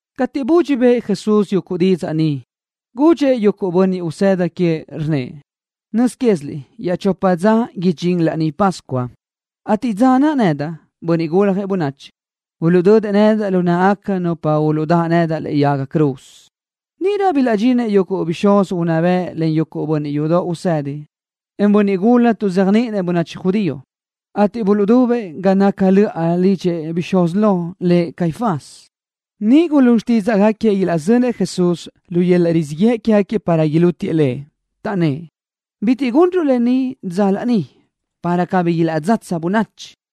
Cateʼ budxi bëʼë Jesús yuguʼ didzaʼ ni, gudxëʼ yuguʼ bönniʼ usëda queëʼ, rnnëʼ: —Nöz quéziliʼ iaʼchopa dza idxín Laní Pascua, ateʼ dza naʼ nedaʼ, Bönniʼ Guljëʼ Bönachi, uluʼdödëʼ nedaʼ lu náʼagaca nupa uluʼdáʼ nedaʼ lëʼe yaga cruz. Níʼirö bilaʼdxinëʼ yuguʼ bixúz unná bëʼ len yuguʼ bönniʼ yudoʼ usedi, en bönniʼ gula tuʼzéajniʼinëʼ bönachi judío, ateʼ buluʼdubëʼ ga naca löʼa lidxi bixúz lo, lëʼ Caifás. Niʼ gulún xtídzaʼgaquiëʼ ilaʼzönëʼ Jesús, lu yöl-laʼ rizíʼ yëʼ quégaquiëʼ, para ilútiëʼ Lëʼ. Taʼnnë́ʼ: —Bitiʼ gunruʼ lë ni dza laní, para cabí ilaʼdzatsa bönachi.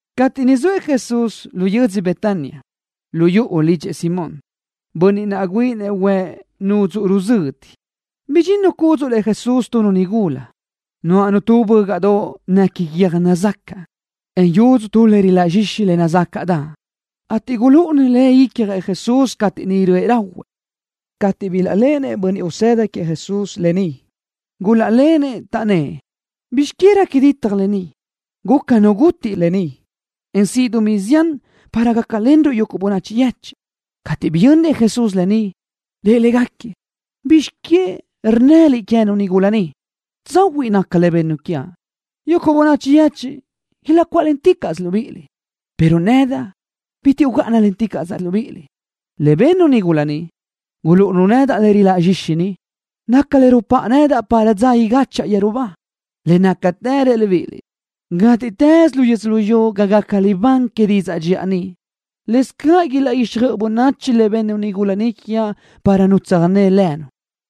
Cateʼ niʼ zoëʼ Jesús lu yödzö Betania lu yuʼu lidxëʼ Simón, bönniʼ naʼ güíʼinëʼ huëʼ nudzuʼ ruzödi, bidxinnu cúdzuʼlëʼ Jesús tu nigula, nuáʼanu tu bö́gaʼdoʼ néquini guiö́j nazacaʼ, en yudzu tu le riláʼ zxixi le nazácaʼdaʼ, ateʼ gulúʼunu le icjëʼ Jesús cateʼ niʼ röʼë rahuëʼ. Cateʼ bilaʼléʼenëʼ bönniʼ usëda queëʼ Jesús lë ni, gulaʼlenëʼ, taʼnnë́ʼ: —¿Bizx que réqui ditaj lë ni? Guca nu gutiʼ lë ni, en siʼ dumí zián para gácalenruʼ yuguʼ bönachi yechiʼ. Cateʼ biyönnëʼ Jesús lë ni, rëʼ légaquiëʼ: —¿Bizx que rnnëliʼ queë́nu nigula ni? Tsahuiʼ naca le bennu quiaʼ. Yuguʼ bönachi yechiʼ ilaʼcuáʼlenticaʼsö libíʼiliʼ, pero nedaʼ bitiʼ ugáʼanalenticaʼsaʼ libíʼiliʼ. Le bennu nigula ni, gulúʼunu nedaʼ le riláʼ zxixi ni, naca le rupáʼanu nedaʼ para dza igáchaʼa yeru ba. Le nácatë reaʼ libíʼiliʼ, gátiʼtës luyú yödzölió ga gaca libán que didzaʼ dxiʼa ni, lëscaʼ ilaʼguixjöʼ bönachi le bennu nigula ni quiaʼ para nu tsöjné lënu.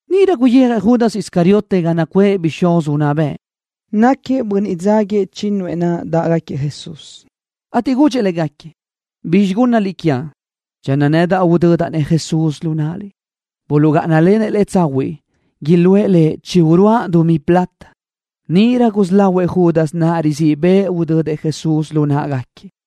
Níʼirö guyijëʼ Judas Iscariote ga naʼ nacuʼë bixúz unná bëʼ. Náquiëʼ bönniʼ dzáguiëʼ chínnuëʼ naʼ dáʼgaquiëʼ Jesús, ateʼ gudxëʼ légaquiëʼ: —¿Bizxi gúnnaliʼ quiaʼ channö nedaʼ udödaʼ-nëʼ Jesús lu náʼaliʼ? Buluʼgáʼanalenëʼ lëʼ tsahuiʼ iluʼë lëʼ chi uruáʼ dumí plata. Níʼirö gusí lahuëʼ Judas naʼ risí riböʼë udödëʼ Jesús lu náʼagaquiëʼ.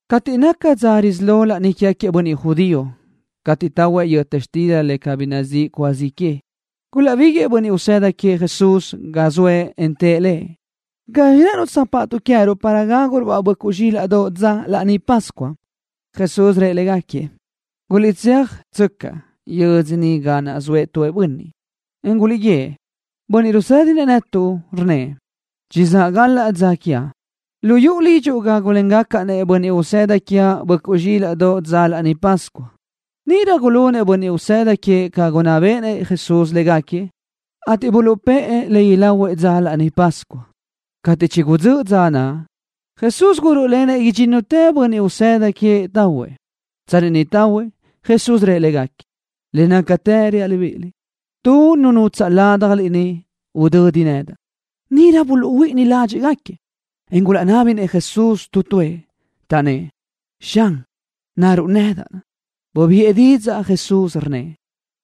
Cateʼ naca dza risí lo laní quégaquiëʼ bönniʼ judío cateʼ tahuëʼ yöta xtila le cabí nazíʼi cúa zi que, gulaʼbíguiʼë bönniʼ usëda queëʼ Jesús ga zoëʼ, en tëʼ Lëʼ: —¿Gazxi rë́ʼënuʼ tsöjpáʼatuʼ queë́ruʼ para gáguruʼ-baʼ böʼcuʼ zxílaʼdoʼ dzöʼ Laní Pascua? Jesús rëʼ légaquiëʼ: —Guliʼtséajtsöcaʼ yödzö niʼ ga naʼ zoëʼ tu bönniʼ, en guliʼguíëʼ: “Bönniʼ rusédinëʼ netuʼ rnnëʼ: Chizáʼ galaʼ dza quiaʼ. Lu yuʼu lidxuʼ gágulengacaʼ-nëʼ bönniʼ usëda quiaʼ böʼcuʼ zxílaʼdoʼ dzöʼ Laní Pascua.” Níʼirö gulunëʼ bönniʼ usëda queëʼ ca naʼ gunná béʼenëʼ Jesús légaquiëʼ, ateʼ buluʼpë́ʼë le ilahuëʼ dzöʼ Laní Pascua. Cateʼ chigudzö́ʼ dza naʼ, Jesús gurö́ʼlenëʼ idxínnutëʼ bönniʼ usëda queëʼ tahuëʼ. Tsanni niʼ tahuëʼ, Jesús rëʼ légaquiëʼ: —Le nácatë reaʼ libíʼiliʼ, tu nu nutsaʼ ládjaliʼ ni udödi nedaʼ. Níʼirö buluʼhuíʼini ládxiʼgaquiëʼ, en gulaʼnábinëʼ Jesús tu tuëʼ, taʼnnë́ʼ: —Xan, ¿naruʼ nedaʼ? Bubiʼë didzaʼ Jesús, rnnëʼ: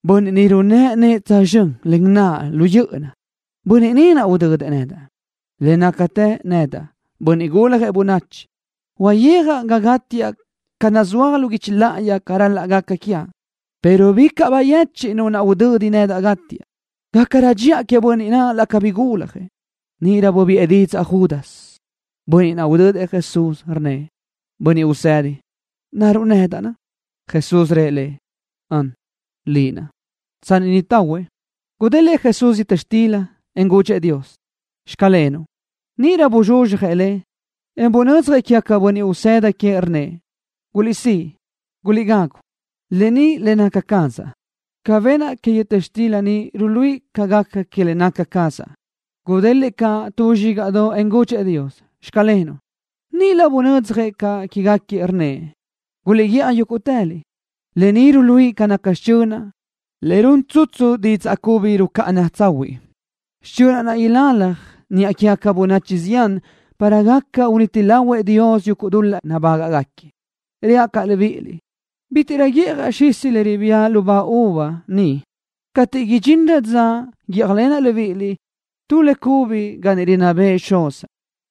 —Bönniʼ ni runë́ʼ nëʼë tsözxö́n len naʼa lu yö́ʼöna, bönniʼ ni udödëʼ nedaʼ. Le nácatë nedaʼ, Bönniʼ Guljëʼ Bönachi, uyijaʼ ga gátiaʼ ca naʼ nazúaj lu guichi láʼayi ca ral-laʼ gaca quiaʼ, pero bicaʼ bayechiʼ nu naʼ udödi nedaʼ gátiaʼ. Gácarö dxiʼa queëʼ bönniʼ naʼ laʼ cabí guljëʼ. Níʼirö bubiʼë didzaʼ Judas, bönniʼ naʼ udödëʼ Jesús, rnnëʼ: —Bönniʼ Usedi, ¿naruʼ nedaʼ? Jesús rëʼ lëʼ: —Ön, liʼ naʼ. Tsanni niʼ tahuëʼ, gudélëʼë Jesús yöta xtila, en gudxëʼ Dios: “Xclenuʼ.” Níʼirö buzxuzxjëʼ le, en bunödzjëʼ quégaquiëʼ bönniʼ usëda queëʼ, rnnëʼ: —Guliʼsíʼ, guliʼgagu. Lë ni le naca cazaʼ. Ca benaʼ que yöta xtila ni ruluíʼi ca gaca que le naca cazaʼ. Gudélëʼë caʼ tu zxígaʼdoʼ, en gudxëʼ Dios: “Xclenuʼ.” Níʼirö bunödzjëʼ caʼ quégaquiëʼ, rnnëʼ: —Guliʼguiʼaj yúguʼtëliʼ. Lë ni ruluíʼi ca naca xichönaʼ le run tsutsu didzaʼ cubi rucáʼana tsahuiʼ. Xichönaʼ naʼ ilalaj niʼa quégaca bönachi zián para gaca uniti lahuëʼ Dios yuguʼ dul-laʼ nabágaʼgaquiëʼ. Reaʼ caʼ libíʼiliʼ, bítiʼrö guíʼjaʼ xisi le ribía lubá uva ni cateʼ idxinrö dza niʼ guíʼjalenaʼ libíʼiliʼ tu le cubi ga niʼ rinná bëʼë Xuzaʼ.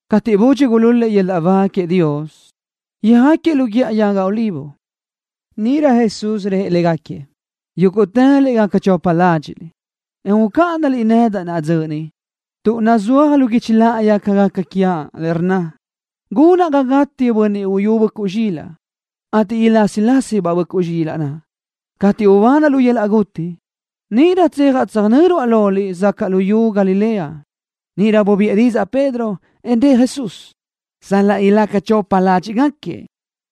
Cateʼ budxi gulúl-lëʼ yöl-laʼ ba queëʼ Dios, yöjáquiëʼ lu Guíʼa Yaga Olivo. Níʼirö Jesús rëʼ légaquiëʼ: —Yúguʼtëliʼ gaca chopa ládxiʼliʼ, en ucáʼanaliʼ nedaʼ naʼa dzöʼ ni, tuʼ nazúaj lu guichi láʼayi ca gaca quiaʼ, le rnna: “Gunaʼ ga gátiëʼ Bönniʼ Uyú Böʼcuʼ Zxilaʼ, ateʼ ilásilasibaʼ böʼcuʼ zxilaʼ naʼ.” Cateʼ ubanaʼ lu yöl-laʼ guti, níʼirö tséajaʼ tsöjnö́ruaʼ loliʼ sacaʼ luyú Galilea. Níʼirö bubiʼë didzaʼ Pedro, en rëʼ Jesús: —Salaʼ ilaca chopa ládxiʼgaquiëʼ,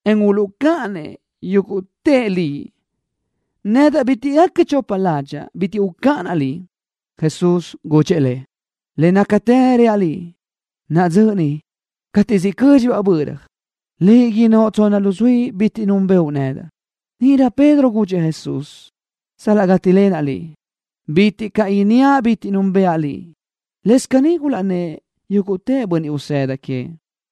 en uluʼcáʼanëʼ yúguʼtëʼ Liʼ, nedaʼ bitiʼ gaca chopa ládxaʼa, bitiʼ ucáʼanaʼ Liʼ. Jesús gudxëʼ lëʼ: —Le nácatë reaʼ liʼ, naʼa dzöʼ ni, cateʼ siʼ cö́dxilöbaʼ böra, liʼ innóʼ tsonna luzuí bitiʼ núnbëʼu nedaʼ. Níʼirö Pedro gudxëʼ Jesús: —Sal-laʼ gátilenteaʼ Liʼ, bitiʼ caʼ inníaʼ bitiʼ núnbëʼa Liʼ. Lëscaʼ caní gulaʼnnë́ʼ yúguʼtë bönniʼ usëda queëʼ.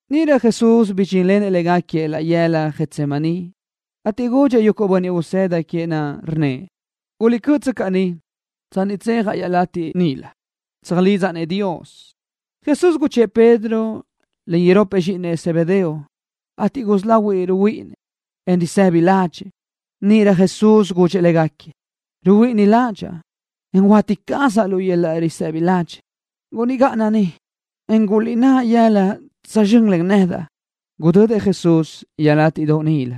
Níʼirö Jesús bidxínlenëʼ légaquiëʼ laʼ yëla Getsemaní, ateʼ gudxëʼ yuguʼ bönniʼ usëda queëʼ naʼ, rnnëʼ: —Guliʼcö́ʼtsöcaʼ ni tsanni tséajaʼ iaʼlatiʼ níʼilö, tsöjlidzaʼ-nëʼ Dios. Jesús guchë́ʼë Pedro len iropëʼ zxíʼinëʼ Zebedeo, ateʼ gusí lahuëʼ ruhuíʼinnëʼ, en risëbi ládxëʼë. Níʼirö Jesús gudxëʼ légaquiëʼ: —Ruhuíʼini ládxaʼa, en huáti cazaʼ lu yöl-laʼ risëbi ladxiʼ. Guliʼgáʼana ni, en guliʼnáʼ yëla tsözxö́n len nedaʼ. Gudödëʼ Jesús iaʼlátiʼdoʼ níʼilö,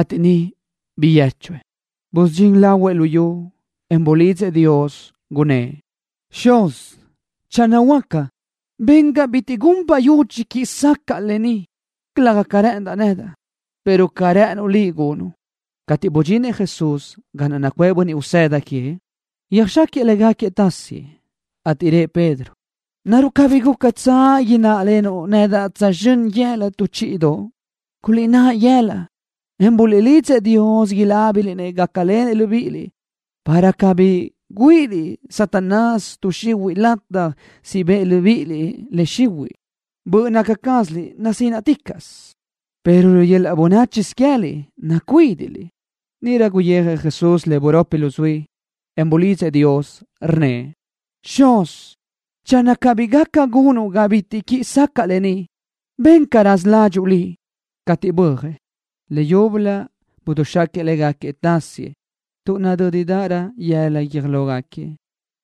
ateʼ niʼ biyéchuëʼ. Busudxín lahuëʼ lu yu, en bulidzëʼ Dios, gunnë́ʼ: —Xuzaʼ, channö huáca, ben ga bitiʼ gun bayudxi quiʼi sacaʼa lë ni, calëga ca rë́ʼëndaʼ nedaʼ, pero ca rë́ʼënuʼ Liʼ gunuʼ. Cateʼ budxinëʼ Jesús ga naʼ nacuʼë bönniʼ usëda queëʼ, yöjxáquiëʼ légaquiëʼ tasiëʼ, ateʼ rëʼ Pedro: —¿Naruʼ cabí gúcatsö ináʼalenuʼ nedaʼ tsözxö́n yëla tu chíʼidoʼ? Guliʼnáʼ yëla, en buliʼlidzëʼ Dios inábiliʼ-nëʼ gácalenëʼ libíʼiliʼ, para cabí güíʼiliʼ Satanás tuʼ xihuiʼ lataj siʼ bëʼ libíʼiliʼ le xihuiʼ. Böʼ naca cázaliʼ nasínaʼticaʼsö, pero lu yöl-laʼ bönáchisö queë́liʼ nacuídiʼliʼ. Níʼirö guyijëʼ Jesús le buropi luzuí, en bulidzëʼ Dios, rnnëʼ: —Xuz, channö cabí gaca gunuʼ ga bitiʼ quiʼi sacaʼa lë ni, ben ca raza ládxuʼu Liʼ. Cateʼ bö́ajëʼ, leyúbölö buduxaquiëʼ légaquiëʼ tasiëʼ tuʼ nadö́dirö yëla guiö́j lógaquiëʼ.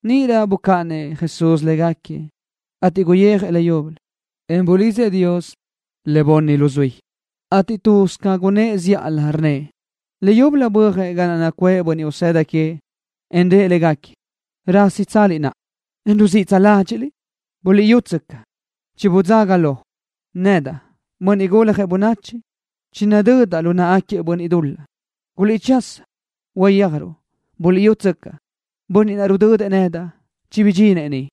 Níʼirö bucáʼanëʼ Jesús légaquiëʼ, ateʼ guyijëʼ leyúbölö, en bulidzëʼ Dios le bunni luzuí, ateʼ tuz ca gunnë́ʼ zíʼalö rnnëʼ. Leyúbölö bö́ajëʼ ga naʼ nacuʼë bönniʼ usëda queëʼ, en rëʼ légaquiëʼ: —¿Rásitsaliʼ naʼa, en ruziʼtsö ládxiʼliʼ? Buliʼyútsöcaʼ, chibudzaga lo. Nedaʼ, Bönniʼ Guljëʼ Bönachi, chinadödaʼ lu náʼagaquiëʼ bönniʼ dul-laʼ. ¡Guliʼchasa, uyéajruʼ! Buliʼyútsöcaʼ, bönniʼ naʼ rudödëʼ nedaʼ chibidxinëʼ ni.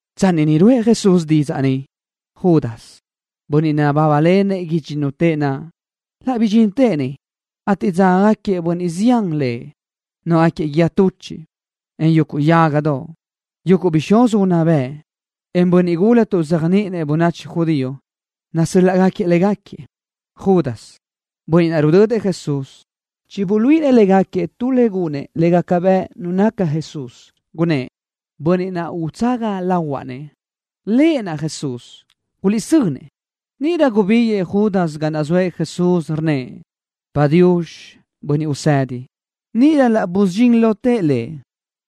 Tsanni niʼ ruʼë Jesús didzaʼ ni, Judas, bönniʼ nabábalenëʼ idxínnutëʼ naʼ, laʼ bidxintëʼ niʼ, ateʼ dzágagaquiëʼ bönniʼ zián lëʼ, nuáʼagaquiëʼ guíë tuchiʼ, en yuguʼ yágadoʼ. Yuguʼ bixúz unná bëʼ, en bönniʼ gula tuʼzéajniʼinëʼ bönachi judío nasö́l-laʼgaquiëʼ légaquiëʼ. Judas, bönniʼ naʼ rudödëʼ Jesús, chibuluíʼinëʼ légaquiëʼ tu le gunëʼ le gaca bëʼ nu naca Jesús, gunnë́ʼ: —Bönniʼ naʼ utsaga lahuaʼ-nëʼ, Lëʼ naʼ Jesús. Guliʼsönëʼ. Níʼirö gubíguiʼë Judas ga naʼ zoëʼ Jesús, rnnëʼ: —Padiux, Bönniʼ Usedi. Níʼirö laʼ busudxín lotëʼ Lëʼ.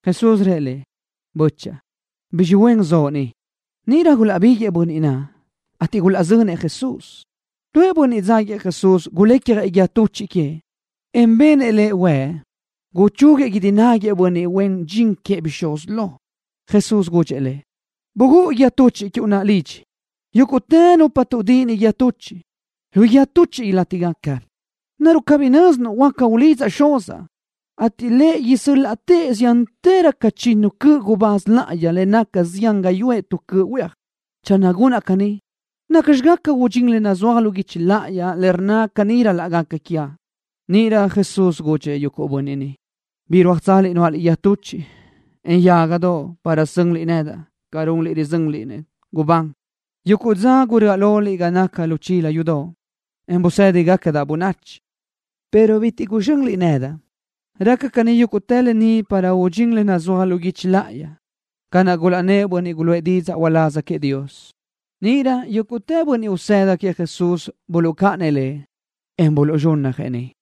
Jesús rëʼ lëʼ: —Böchaʼa, ¿bizxi huen zoʼo ni? Níʼirö gulaʼbiguëʼë bönniʼ naʼ, ateʼ gulaʼzönëʼ Jesús. Tuëʼ bönniʼ dzáguiëʼ Jesús gulecjëʼ guíë tuchiʼ queëʼ, en benëʼ huëʼ, guchúguiëʼ guídi náguiëʼ bönniʼ huen dxin queëʼ bixúz lo. Jesús gudxëʼ lëʼ: —Bugúʼ guíë tuchiʼ quiuʼ lidxi. Yúguʼtë nupa tuʼdíʼini guíë tuchiʼ, lu guíë tuchiʼ ilátigaca. ¿Naruʼ cabí nö́zinuʼ huáca ulidzaʼ Xuzaʼ, ateʼ Lëʼ laʼ isö́l-laʼtëʼ ziántërö ca chinnu cöʼ gubáz láʼayi le naca zián gáyuʼë tu cöʼ huéaj? Channö gunaʼ caní, ¿nacxi gaca udxín le nazúaj lu guichi láʼayi, le rnna caní ral-laʼ gaca quiaʼ? Níʼirö Jesús gudxëʼ yuguʼ bönniʼ niʼ: —¿Birúajtsaliʼ nuáʼaliʼ guíë tuchiʼ, en yágadoʼ para sönliʼ nedaʼ ca runliʼ rizönliʼ-nëʼ gubán? Yuguʼ dza guröʼa loliʼ ga naca lu chila yudoʼ, en busédigacadaʼ bönachi, pero bitiʼ guzxönliʼ nedaʼ. Raca caní yúguʼtë lë ni para udxín le nazúaj lu guichi láʼayi, ca naʼ gulaʼnnë́ʼ bönniʼ guluʼë didzaʼ uláz queëʼ Dios. Níʼirö yúguʼtë bönniʼ usëda queëʼ Jesús buluʼcáʼanëʼ Lëʼ, en buluʼzxúnnajëʼ niʼ.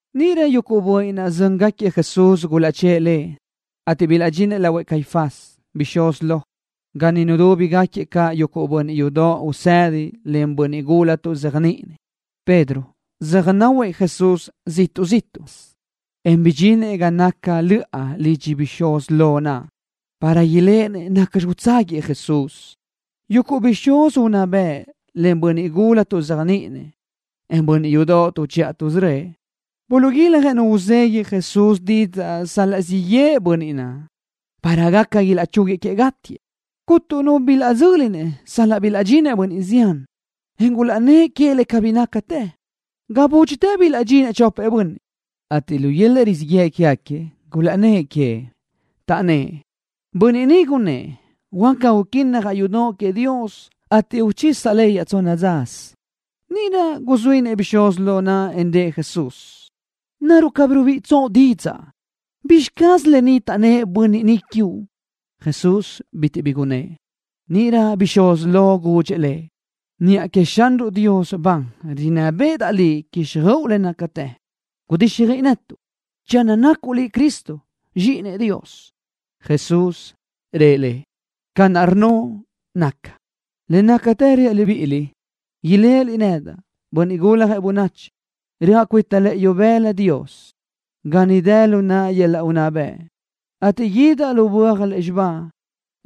Níʼirö yuguʼ bönniʼ naʼ zö́ngaquiëʼ Jesús gulaʼchë́ʼë Lëʼ, ateʼ bilaʼdxinëʼ lahuëʼ Caifás, bixúz lo, ga niʼ nudúbigaquiëʼ caʼ yuguʼ bönniʼ yudoʼ usedi len bönniʼ gula tuʼzéajniʼinëʼ. Pedro söjnáhuëʼ Jesús ziʼtuʼ zíʼtuʼsö, en bidxinëʼ ga naca löʼa lidxi bixúz lo naʼ, para iléʼenëʼ nacxi utságuiëʼ Jesús. Yuguʼ bixúz unná bëʼ len bönniʼ gula tuʼzéajniʼinëʼ, en bönniʼ yudoʼ tuʼchiʼa tuʼsörö́ëʼ, buluʼguiljëʼ nu uzegui Jesús didzaʼ sal-laʼ siʼ yëʼë bönniʼ naʼ, para gaca ilaʼchúguiëʼ queëʼ gátiëʼ. Cuntu nu bilaʼdzö́linëʼ sal-laʼ bilaʼdxinëʼ bönniʼ zián, en gulaʼnnë́ʼ queëʼ le cabí nácatë. Ga búdxitë bilaʼdxinëʼ chopëʼ bönniʼ, ateʼ lu yöl-laʼ rizíʼ yëʼ quégaquiëʼ gulaʼnnë́ʼ queëʼ, taʼnnë́ʼ: —Bönniʼ ni gunnë́ʼ: “Huaca uquínnajaʼ yudoʼ queëʼ Dios, ateʼ uchisaʼ le iaʼtsonna dzasö.” Níʼirö guzuínëʼ bixúz lo naʼ, en rëʼ Jesús: —¿Naruʼ cabí rubíʼitsoʼ didzaʼ? ¿Bizxi caz lë ni taʼnnë́ʼ bönniʼ ni quiuʼ? Jesús bitiʼ bi gunnë́ʼ. Níʼirö bixúz lo gudxëʼ Lëʼ: —Niʼa queëʼ Xanruʼ Dios ban rinná béʼedaʼ Liʼ quíxjöʼu le nácatë. Gudíxjöiʼi netuʼ channö nacuʼ Liʼ Cristo, Zxíʼinëʼ Dios. Jesús rëʼ lëʼ: —Ca naʼ rnnoʼ nacaʼ. Le nácatë reaʼ libíʼiliʼ, iléʼeliʼ nedaʼ, Bönniʼ Guljëʼ Bönachi, röʼa cuita lëʼë ibëla Dios, ga niʼ dë lu naʼa yöl-laʼ unná bëʼ, ateʼ guídaʼ lu böaj lúzxiba,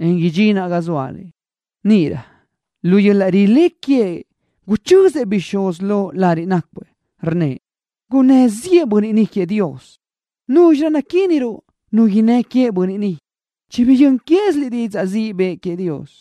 en idxinaʼ ga zóaliʼ. Níʼirö lu yöl-laʼ rilé queëʼ guchözëʼ bixúz lo lariʼ nácuëʼ, rnnëʼ: —¡Gunnë́ ziʼë bönniʼ ni queëʼ Dios! ¿Núzxirö naquíniruʼ nu innë́ queëʼ bönniʼ ni? Chibiyö́n quéziliʼ didzaʼ ziʼ bëʼë queëʼ Dios.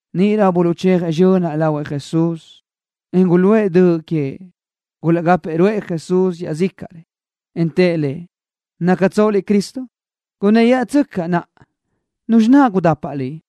Níʼirö buluʼchejëʼ zxönaʼ lahuëʼ Jesús, en guluʼë döʼ queëʼ. Gulaʼgápëʼë ruʼë Jesús iaʼzícaʼrëʼ, en tëʼ Lëʼ: —¿Nácatsoʼ Liʼ Cristo? Gunnë́yaʼatsöcaʼ naʼa, ¿nuzxi naʼ gudapaʼ Liʼ?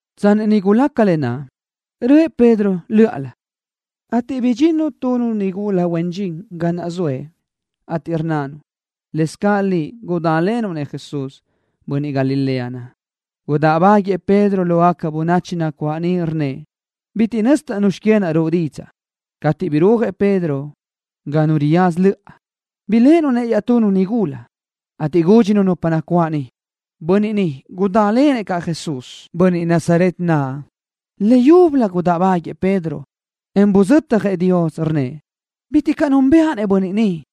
Tsanni niʼ gulaca lë naʼ, röʼë Pedro lö́ʼalö, ateʼ bidxinnu tunu nigula huen dxin ga naʼ zoëʼ, ateʼ rnnanu: —Lëscaʼ liʼ gudálenuʼ Jesús, bönniʼ Galilea naʼ. Gudáʼbaguëʼë Pedro lógaca bönachi nacuáʼ niʼ, rnnëʼ: —Bitiʼ nözdaʼ nuzxi que naʼ ruʼu didzaʼ. Cateʼ birúajëʼ Pedro ga nu riyaza löʼa, biléʼenu-nëʼ iaʼtunu nigula, ateʼ gúdxinu nupa nacuáʼ niʼ: —Bönniʼ ni gudálenëʼ caʼ Jesús, bönniʼ Nazaret naʼ. Leyúbölö gudáʼbaguëʼë Pedro, en buzötjëʼ Dios, rnnëʼ: —Bitiʼ caʼ núnbëʼa-nëʼ bönniʼ ni.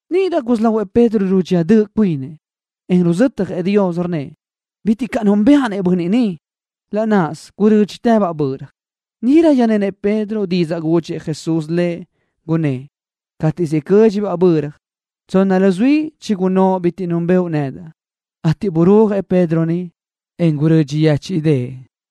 Níʼirö gusí lahuëʼ Pedro rudxía döʼ cuinëʼ, en ruzötjëʼ Dios, rnnëʼ: —Bitiʼ caʼ núnbëʼa-nëʼ bönniʼ ni. Laʼ náʼasö gurö́dxitëbaʼ böra. Níʼirö yöjnenëʼ Pedro didzaʼ gudxëʼ Jesús lëʼ, gunnë́ʼ: Cateʼ siʼ cö́dxilöbaʼ böra, tsonna luzuí chigunnóʼ bitiʼ núnbëʼu nedaʼ, ateʼ burúajëʼ Pedro niʼ, en gurödxi yéchiʼdëʼë.